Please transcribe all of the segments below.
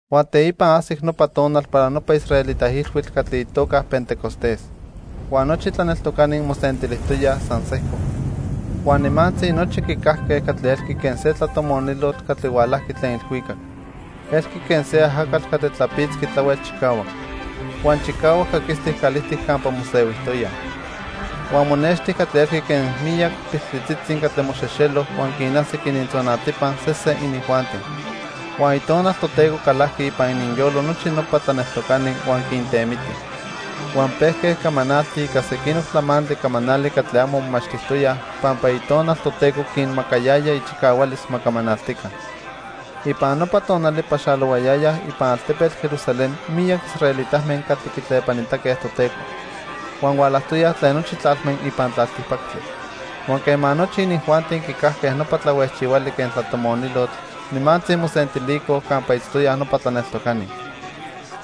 Huan teipa ajsic nopa tonal para nopa israelita ilhuitl catli itoca Pentecostés. Huan nochi tlaneltocani mosentilijtoyaj san sejco. Huan nimantzi nochi quicajque catli elqui quen se tlatomonilotl catli hualajqui tlen ilhuicac. Elqui quen se ajacatl catli tlapitzqui tlahuel chicahuac. Huan chicahuac caquistic calijtic campa mosehuijtoyaj. Huan monexti catli elqui quen miyac piltlitzitzi catli moxejxelo huan quinajsic inintzonatipa sesen inijuanti. Huan Itonal Toteco calajqui ipan ininyolo nochi nopa tlaneltocani huan quintemiti. Huan pejque camanaltij ica sequinoc tlamantli camanali catli amo momachtijtoyaj pampa Itonal Toteco quinmacayaya ichicahualis ma camanaltica. Ipan nopa tonali paxalohuayayaj ipan altepetl Jerusalén miyac israelitame catli quitlepanitaque Toteco. Huan hualajtoyaj tlen nochi tlalme ipan tlaltipactli. Huan quema nochi inijuanti quicajque nopa tlahuejchihuali quen tlatomonilotl, nimantzi mosentilicoj campa itztoyaj nopa tlaneltocani.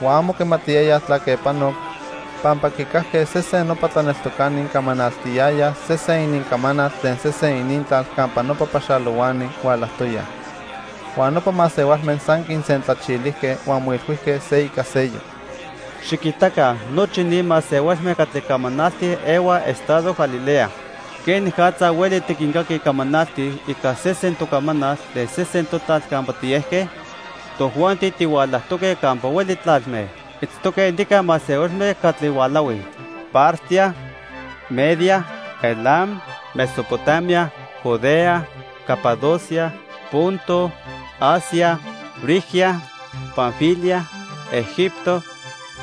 Huan amo quimatiyayaj tlaque panoc, pampa quicajque sesen nopa tlaneltocani camanaltiyayaj sesen inincamanal tlen sesen inintlal campa nopa paxalohuani hualajtoyaj. Huan nopa masehualme san quinsentlachilijque huan moilhuijque se ica seyoc: —Xiquitaca, nochi ni masehualme catli camanaltij ehuaj estado Galilea. ¿Quenicatza hueli tiquincaquij camanaltij ica sesen tocamanal tlen sesen totlal campa tiejque? Tojuanti tihualajtoque campa hueli tlalme. Itztoque nica masehualme catli hualahuij: Partia, Media, Elam, Mesopotamia, Judea, Capadocia, Ponto, Asia, Frigia, Panfilia, Egipto,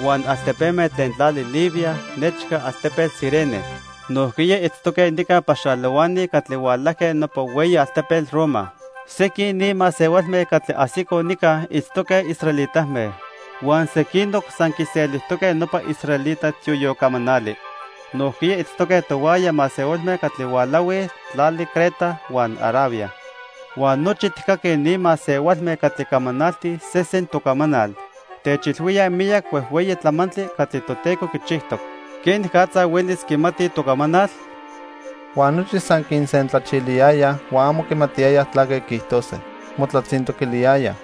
huan altepeme tlen tlali Libia nechca altepetl Cirene. Nojquiya itztoque nica paxalohuani catli hualajque nopa hueyi altepetl Roma. Sequin ni masehualme catli ajsicoj nica itztoque israelitame, huan sequinoc san quiselijtoque nopa israelita tioyocamanali. Nojquiya itztoque tohuaya masehualme catli hualahuij tlali Creta huan Arabia. Huan nochi tijcaquij ni masehualme catli camanaltij sesen tocamanal. Techilhuíaj miyac huejhueyi tlamantli catli Toteco quichijtoc. ¿Quenicatza huelis quimatij tocamanal? Huan nochi san quinsentlachiliyayaj huan amo quimatiyayaj tlaque quiijtose. Motlatzintoquiliyayaj: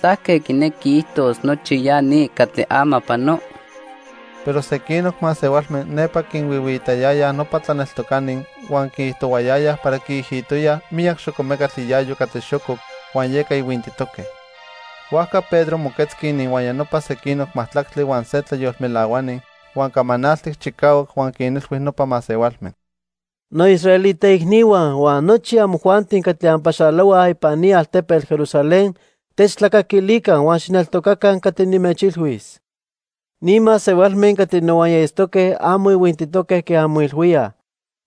—¿Tlaque quinequi quiijtos nochi ya ni catli ama pano? Pero sequinoc masehualme nepa quinhuihuiitayayaj nopa tlaneltocani huan quiijtohuayayaj para quiijitoyaj miyac xocomecatl iayo catli xococ, huan yeca ihuintitoque. Huajca Pedro moquetzqui ininhuaya nopa sequinoc majtlactli huan se tlayolmelahuani, huan camanaltic chicahuac huan quinilhui nopa masehualme: "Noisraelita icnihua huan nochi amojuanti catli anpaxalohuaj ipan ni altepetl Jerusalén, techtlacaquilica huan xijneltocaca catli nimechilhuis. Ni masehualme catli nohuaya itztoque amo ihuintitoque quen anmoilhuíaj,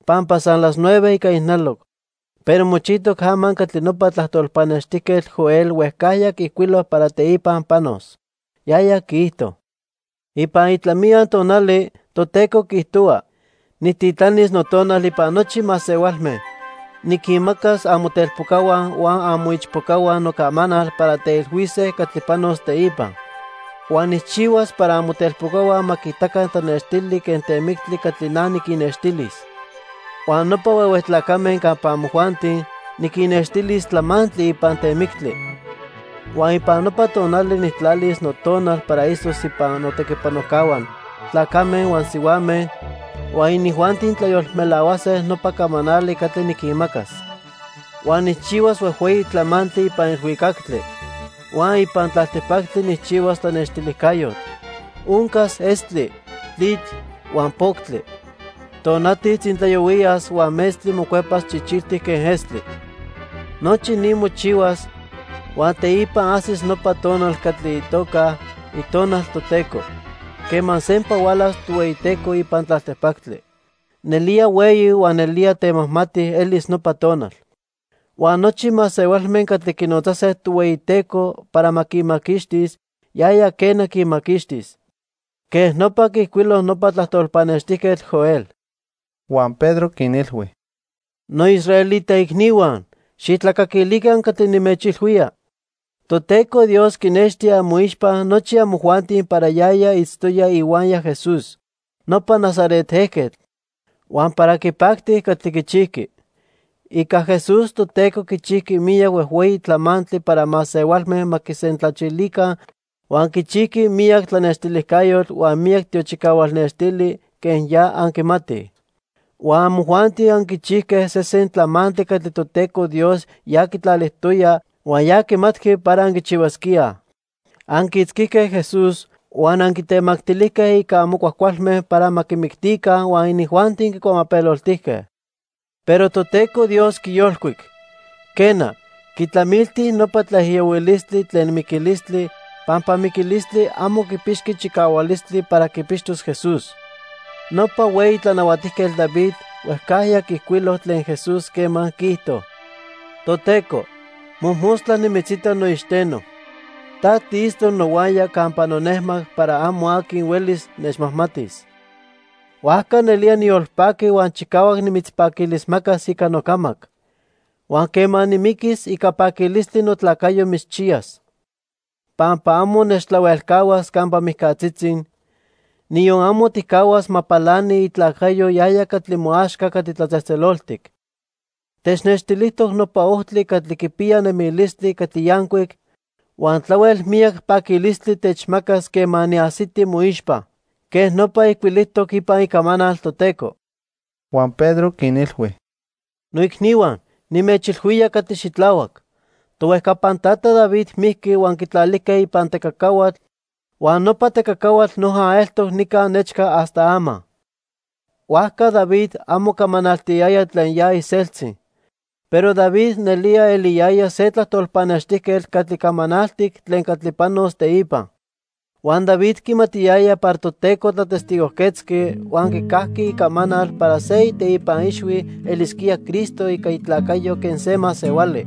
pampa san las nueve ica ijnaloc. Pero mochijtoc ama catli nopa tlajtol pannextijquetl Joel huejcajya quiijcuilo para teipa panos. Yaya quiijto: 'Ipan itlamiya tonali, Toteco quiijtohua, Nijtitlanis Notonal ipan nochi masehualme. Niquinmacas amotelpocahua huan amoichpocahua nocamanal para teilhuise catli panos teipa. Huan nijchihuas para amotelpocahua ma quiitaca tlanextili quen temictli catli na niquinnextilis, huan nopa huehue tlacame campa amojuanti, niquinnextilis tlamantli ipan temictli. Huan ipan nopa tonali nijtlalis noTonal para itztos ipan notequipanojcahua, tlacame huan sihuame, huan inijuanti tlayolmelahuase nopa camanali catli niquinmacas. Huan nijchihuas huejhueyi tlamantli ipan ilhuicactli. Huan ipan tlaltipactli nijchihuas tlanextilijcayotl. Oncas estli, tlitl, huan poctli. Tonati tzintlayohuiyas huan metztli mocuepas chichiltic quen estli. Nochi ni mochihuas, huan teipa ajsis nopa tonal catli itoca "itonal Toteco" quema sempa hualas Tohueyiteco ipan tlaltipactli. Nelía hueyi huan nelía temajmati elis nopa tonal. Huan nochi masehualme catli quinotzase Tohueyiteco para ma quinmaquixtis, yaya, quena, quinmaquixtis.' Quej nopa quiijcuilo nopa tlajtol pannextijquetl Joel." Huan Pedro quinilhui: "Noisraelita icnihua, xijtlacaquilica catli nimechilhuía. Toteco Dios quinexti amoixpa nochi amojuanti para yaya itztoya ihuaya Jesús, nopa Nazaret ejquetl, huan para quipacti catli quichijqui. Ica Jesús, Toteco quichijqui miyac huejhueyi tlamantli para masehualme ma quisentlachilica huan quichijqui miyac tlanextilijcayotl huan miyac tiochicahual nextili, quen ya anquimatij. Huan amojuanti anquichijque sesen tlamantli catli Toteco Dios ya quitlalijtoya huan ya quimatqui para anquichihuasquíaj. Anquiitzquijque Jesús huan anquitemactilijque ica amo cuajcualme para ma quimictica, huan inijuanti quicuamapeloltijque. Pero Toteco Dios quiyolcuic. Quena, quitlamilti nopa tlaijiyohuilistli tlen miquilistli pampa miquilistli amo quipixqui chicahualistli para quipixtos Jesús. Nopa hueyi tlanahuatijquetl David huejcajya quiijcuilo tlen Jesús quema quiijto: 'Toteco, mojmostla nimitzita noixteno. Ta tiitztoc nohuaya campa nonejmac para amo aqui huelis nechmajmatis. Huajca nelía niyolpaqui huan chicahuac nimitzpaquilismacas ica nocamac. Huan quema nimiquis, ica paquilistli notlacayo mitzchiyas. Pampa amo nechtlahuelcahuas campa mijcatzitzi, niyon amo tijcahuas ma palani itlacayo yaya catli moaxca catli tlatzejtzeloltic. Technextilijtoc nopa ojtli catli quipiya nemilistli catli yancuic, huan tlahuel miyac paquilistli techmacas quema niajsiti moixpa.' Quej nopa ijcuilijtoc ipan icamanal Toteco." Huan Pedro quinilhui: "Noicnihua, nimechilhuía catli xitlahuac. Tohuejcapan tata David mijqui huan quitlalijque ipan tecacahuatl huan nopa tecacahuatl noja eltoc nica nechca hasta ama. Huajca David amo camanaltiyaya tlen ya iseltzi. Pero David nelía eliyaya se tlajtol pannextijquetl catli camanaltic tlen catli panos teipa. Huan David quimatiyaya para Toteco tlatestigojquetzqui huan quicajqui icamanal para se iteipa ixhui elisquía Cristo ica itlacayo quen se masehuali.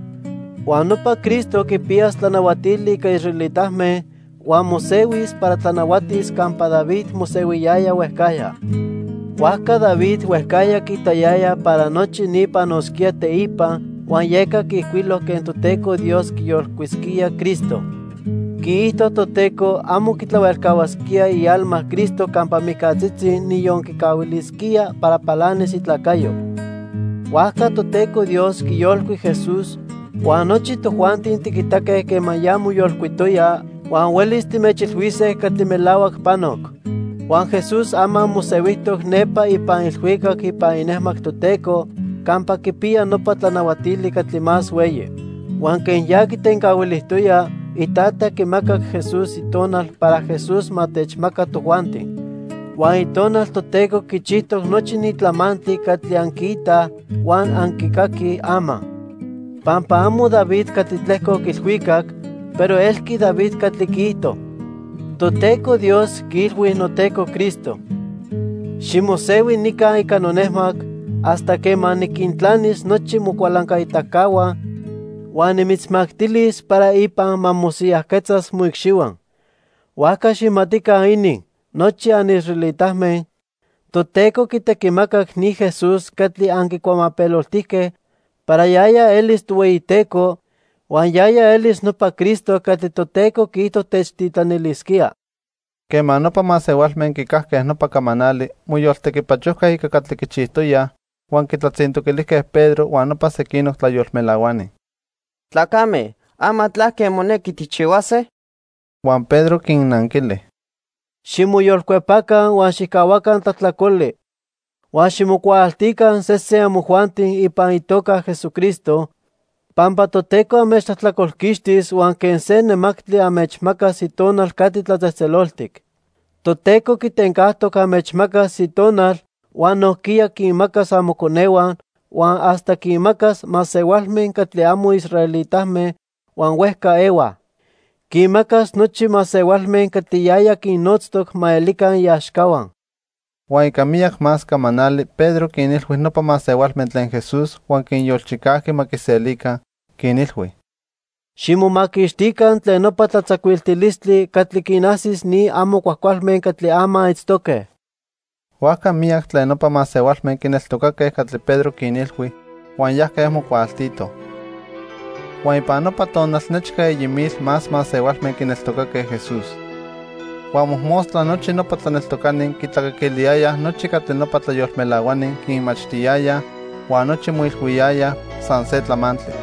Huan nopa Cristo quipiyas tlanahuatili ica israelitame huan mosehuis para tlanahuatis campa David mosehuiyaya huejcajya. Huajca David huejcajya quiitayaya para nochi ni panosquía teipa huan yeca quiijcuilo quen Toteco Dios quiyolcuisquía Cristo. Quiijto Toteco amo quitlahuelcahuasquía ialma Cristo campa mijcatzitzi, niyon quicahuilisquía para palanis itlacayo. Huajca Toteco Dios quiyolcuic Jesús, huan nochi tojuanti tiquitaque quema ya moyolcuitoya huan huelis timechilhuise catli melahuac panoc. Huan Jesús ama mosehuijtoc nepa ipan ilhuicac ipan inejmac Toteco campa quipiya nopa tlanahuatili catli más hueyi. Huan quen ya quitencahuilijtoya, Itata quimacac Jesús Itonal para Jesús ma techmaca tojuanti. Huan Itonal Toteco quichijtoc nochi ni tlamantli catli anquiitaj huan anquicaquij ama. Pampa amo David catli tlejcoc ilhuicac, pero elqui David catli quiijto: 'Toteco Dios quiilhui noTeco Cristo: Ximosehui nica ica nonejmac, hasta quema niquintlanis nochi mocualancaitacahua, huan nimitzmactilis para ipan ma mosiyajquetzas moicxihua.' "Huajca xijmatica inin, nochi anisraelitame, Toteco quitequimacac ni Jesús catli anquicuamapeloltijque para yaya elis Tohueyiteco huan yaya elis nopa Cristo catli Toteco quiijto techtitlanilisquía." Quema nopa masehualme quicajque nopa camanali, moyoltequipachojque ica catli quichijtoyaj, huan quitlatzintoquilijque Pedro huan nopa sequinoc tlayolmelahuani: —Tlacame, ama ¿tlaque monequi tijchihuase? Huan Pedro quinnanquili: —Ximoyolcuepaca huan xijcahuaca tlajtlacoli huan ximocuaaltica sesen amojuanti ipan itoca Jesucristo, pampa Toteco anmechtlajtlacolquixtis huan quen se nemactli anmechmacas Itonal catli tlatzejtzeloltic. Toteco quitencajtoc anmechmacas Itonal huan nojquiya quinmacas amoconehua, huan hasta quinmacas masehualme catli amo israelitame huan huejca ehuaj. Quinmacas nochi masehualme catli yaya quinnotztoc ma elica iaxcahua. Huan ica miyac más camanali Pedro quinilhui nopa masehualme tlen Jesús huan quinyolchicajqui ma quiselica, quinilhui: —Ximomaquixtica tlen nopa tlatzacuiltilistli catli quinajsis ni amo cuajcualme catli ama itztoque. Huajca miyac tlen nopa masehualme quineltocaque catli Pedro quinilhui, huan yajque mocuaaltitoj. Huan ipan nopa tonal nechca eyi mil más masehualme quineltocaque Jesús. Huan mojmostla nochi nopa tlaneltocani quitlacaquiliyayaj nochi catli nopa tlayolmelahuani quinmachtiyayaj huan nochi moilhuiyayaj san se tlamantli.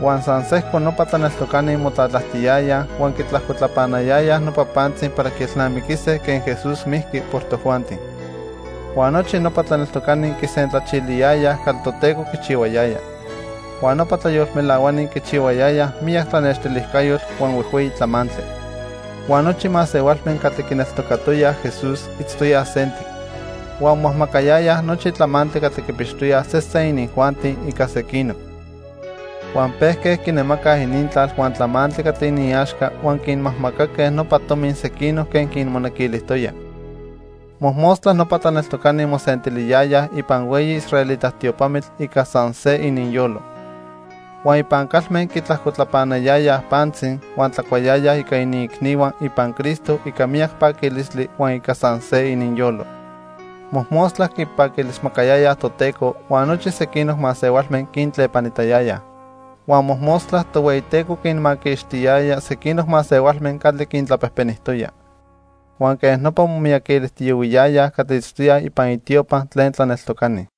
Huan san sejco nopa tlaneltocani motlatlajtiyayaj huan quitlajcotlapanayayaj nopa pantzi para quielnamiquise quen Jesús mijqui por tojuanti. Huan nochi nopa tlaneltocani quisentlachiliyayaj catli Toteco quichihuayaya. Huan nopa tlayolmelahuani quichihuayayaj miyac tlanextilijcayotl huan huejhueyi tlamantli. Huan nochi masehualme catli quineltocatoyaj Jesús itztoyaj sentic. Huan momajmacayayaj nochi tlamantli catli quipixtoyaj sesen inijuanti ica sequinoc. Huan pejque quinemacaj inintlal huan tlamantli catli iniaxca huan quinmajmacaque nopa tomi sequinoc quen quinmonequilijtoyaj. Mojmostla nopa tlaneltocani mosentiliyayaj ipan hueyi israelita tiopamitl ica san se ininyolo. Huan ipan calme quitlajcotlapanayayaj pantzi, huan tlacuayayaj ica iniicnihua ipan Cristo ica miyac paquilistli huan ica san se ininyolo. Mojmostla quipaquilismacayayaj Toteco, huan nochi sequinoc masehualme quintlepanitayayaj. Huan mojmostla Tohueyiteco quinmaquixtiyaya sequinoc masehualme catli quintlapejpenijtoya. Huan quej nopa momiyaquilijtiyohuiyayaj catli itztoyaj ipan itiopa tlen tlaneltocani.